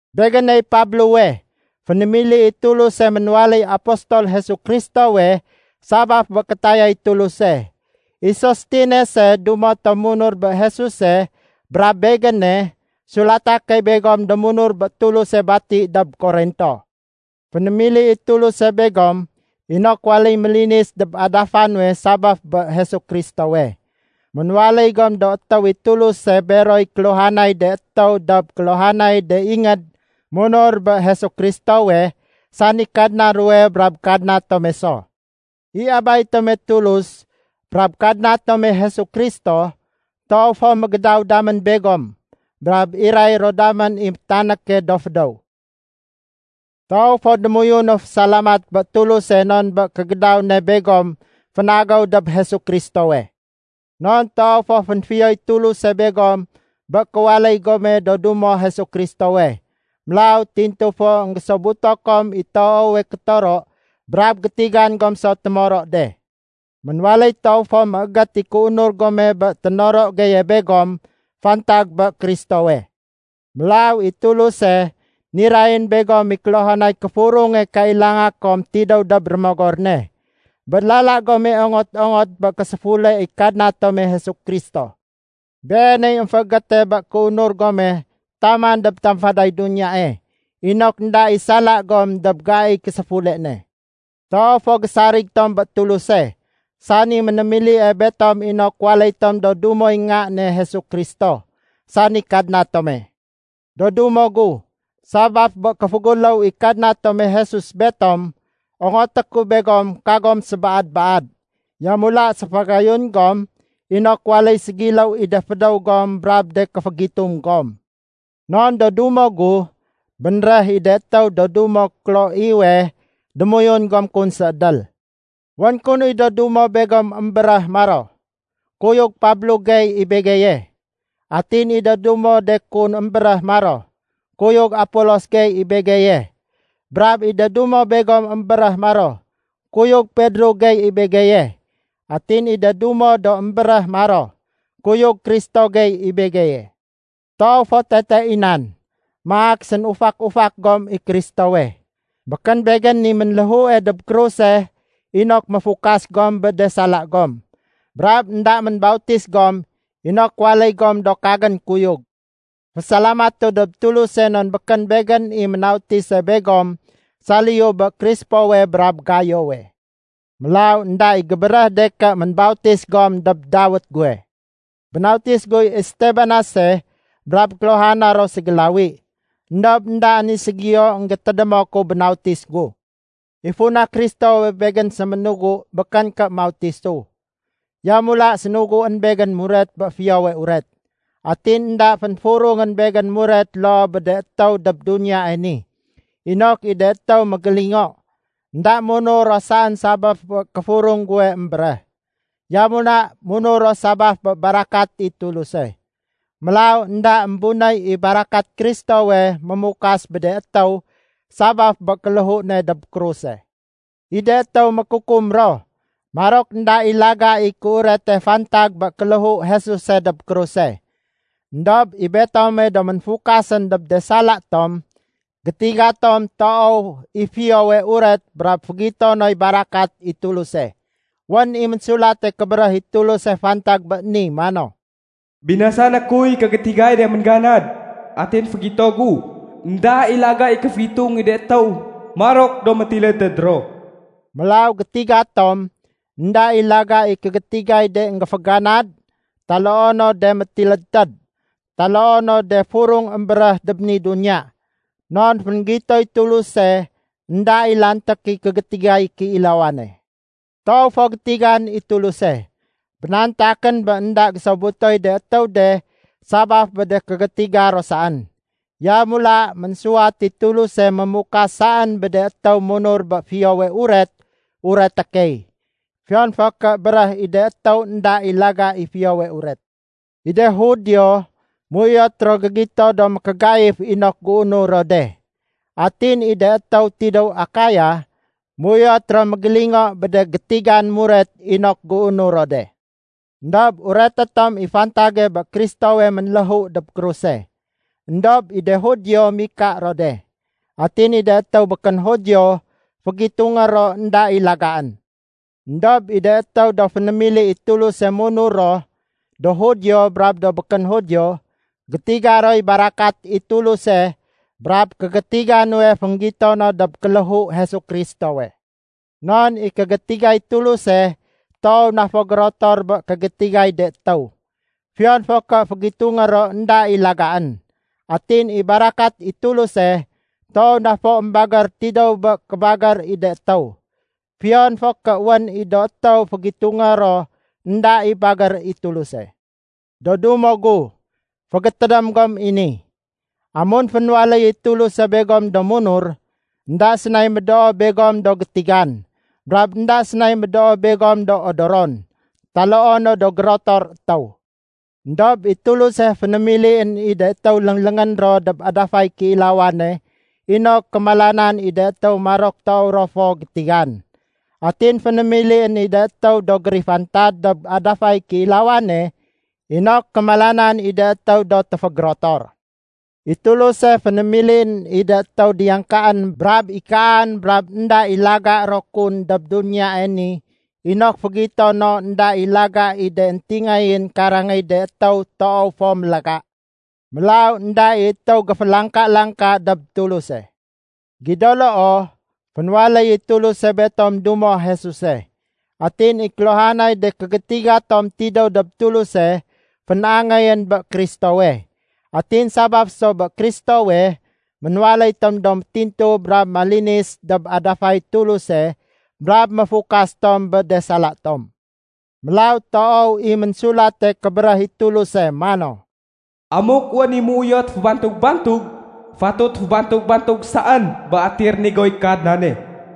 Begéney Pablowe, fénémili i Tuluse ménwaléy apostol Jesu Kristowe sabaf bé kétayay Tuluse. I Sostenese dumo tom munur bé Jesuse brab begéne, sulata key begom do munur bé Tuluse bati dob Korinto. Fénémili i Tuluse begom inok waléy mélinis dob adafa nuwe sabaf bé Jesu Kristowe. Ménwaléy gom do étéw i Tuluse beroy kéluhanay de étéw dob kéluhanay de ingéd munur bé Jesu Kristowe, sani Kadna ruwe brab Kadna tome so. I Abay tome Tuluse brab Kadna tome Jesu Kristo toow fo mégédaw damén begom brab iray ro damén i métanéke do fédéw. Toow fo démoyunu fésalamat bé Tuluse non bé kégédaw ne begom fénagéw dob Jesu Kristowe. Non toow fo fénfiyoy Tuluse begom bé kéwaléy gome do dumo Jesu Kristowe. Mélaw tintu fo énggésobuto kom i toowe kétoro brab gétigan gom so témoro de. Ménwaléy toow fo méégét i kéunur gome bé ténoro geye begom fantag bé Kristowe. Mélaw i Tuluse nirayén begom i kéluhanay kéfurunge kailanga kom tidéw dob Rémogor ne, bé lala gome ongot-ongot bé késéfule i Kadna tome Jesu Kristo. Beeney émféégéte bé kéunur gome taman dob tamfaday duniyae, inok énda i sala gom dob gaiy késéfule ne. Toow fo gésarig tom bé Tuluse, sani ménémilie betom inok waléy tom do dumoy Nga ne Jesu Kristo, sani Kadna tome. Do dumo gu, sabaf bé kéféguléw i Kadna tome Jesus betom ongoté ku begom kagom sébaad-baad. Yamula séfagayun gom inok waléy ségiléw i de fédéw gom brab de kéfégitung gom. Non do dumo gu, bénréh i de étéw do dumo Kloewe démoyun gom kun séédél. Wén kun i do dumo begom émbéréh maro, “Kuyug Pablo gey i begeye.” Atin i de dumo de kun émbéréh maro, “Kuyug Apolos gey i begeye.” Brab i de dumo begom émbéréh ro maro, “Kuyug Pedro gey i begeye.” Atin i de dumo do émbéréh maro, “Kuyug Kristo gey i begeye.” Toow fo tete i nan. Maak sénufak-ufak gom i Kristowe. Békén begén i ménléhue dob kruse inok méfukas gom bé de sala gom. Brab énda ménbautis gom inok waléy gom do kagén kuyug. Fésalamatu dob Tuluse non békén begén i ménautise begom saliyu bé Krispowe brab Gayowe. Mélaw énda i gébéréh de ké ménbautis gom dob dawét guwe. (Bénautis guy Estabanase brab kéluhana ro ségélawi. Endob éndaén i ségiyo énggétédémo ku bénautis gu.) I funa Kristowe begén séménugu békén ké mautisu. Yamula sénuguén begén muret bé Fiyowe Uret. Atin énda fénfurungén begén muret loo bé de étéw dob duniyae ni, inok i de étéw mégélingo, énda munur ro saén sabaf bé kéfurung guwe émbéréh. Yamula munur ro sabaf bé barakat i Tuluse. Mélaw énda émbunéy i barakat Kristowe mémukas bé de étéw sabaf bé kéléhu ne dob kruse. I de étéw mékukum ro, marok énda i laga i kéurete fantag bé kéléhu Jesuse dob kruse. Endob i betome do ménfukasén dob de sala tom, gétiga tom toow i Fiyowe Uret brab fégito noy barakat i Tuluse. Wén i Ménsulate Kébéréh i Tuluse fantag bé ni mano, “Binasané kuy kégétigay de méngganad. Atin fégito gu énda i laga i kéfégitung i de étéw marok do métilédtéd ro.” Mélaw gétiga tom énda i laga i kégétigay de énggéféganad taloo no de métilédtéd taloo no de furung émbéréh dob ni duniya. Non fénggitoy Tuluse énda i lanték i kégétigay kéilawane. Toow fo gétigan i Tuluse. Bénantakén bé énda gésobutoy de étéw de sabaf bé de kégétiga ro saén. Yamula ménsuwat i Tuluse mémukas saén bé de étéw munur bé Fiyowe Uret ureté key, fiyon fo ké béréh i de étéw énda i laga i Fiyowe Uret. I de Judio méuyot ro gégito do mékégaif inok géunur ro de. Atin i de étéw tidéw Akaya méuyot ro mégélingo bé de gétigan muret inok géunur ro de. Endob ureté tom i fantage bé Kristowe ménléhu dob kruse. Endob i de Judio mika ro de. Atin i de étéw békén Judio fégitungé ro énda i lagaén. Endob i de étéw do fénémili i Tuluse munur ro, do Judio brab do békén Judio, gétiga roy barakat i Tuluse brab kégétiga nuwe fénggito no dob kéléhu Jesu Kristowe. Non i kégétigay Tuluse toow na fo gérotor bé kégétigay de étéw, fiyon fo ké fégitungé ro énda i lagaén. Atin i barakat i Tuluse toow na fo émbagér tidéw bé kébagér i de étéw, fiyon fo ké wén i do étéw fégitungé ro énda i bagér i Tuluse. Do dumo gu, fégétédém gom i ni. Amun fénwaléy i Tuluse begom do munur, énda sénay médoo begom do gétigan, brab énda sénay médoo begom do odoron, taloo no do gérotor étéw. Endob i Tuluse fénémilién i de étéw léngléngén ro dob adafay kéilawane inok kémalanan i de étéw marok toow ro fo gétigan. Atin fénémilién i de étéw do gérifantad dob adafay kéilawane inok kémalanan i de étéw do téfégérotor. I Tuluse fénémilién i de étéw diyangkaén brab ikaan brab énda i laga ro kun dob duniyae ni inok fégito no énda i laga i de éntingayén karangéy de étéw toow fo mélaga. Mélaw énda i étéw géfélangka-langka dob Tuluse. Gido loo, fénwaléyéy Tuluse betom dumo Jesuse. Atin i kéluhanay de kégétiga tom tidéw dob Tuluse fén-angéyén bé Kristowe. Atin sabaf so bé Kristowe, ménwaléy tom do métintu brab malinis dob adafay Tuluse brab méfukas tom bé de sala tom. Mélaw toow i Ménsulate Kébéréh i Tuluse mano, “Amuk wén i méuyot fébantug-bantug, fatut fébantug-bantug saén bé atiy rénigoy Kadnane.”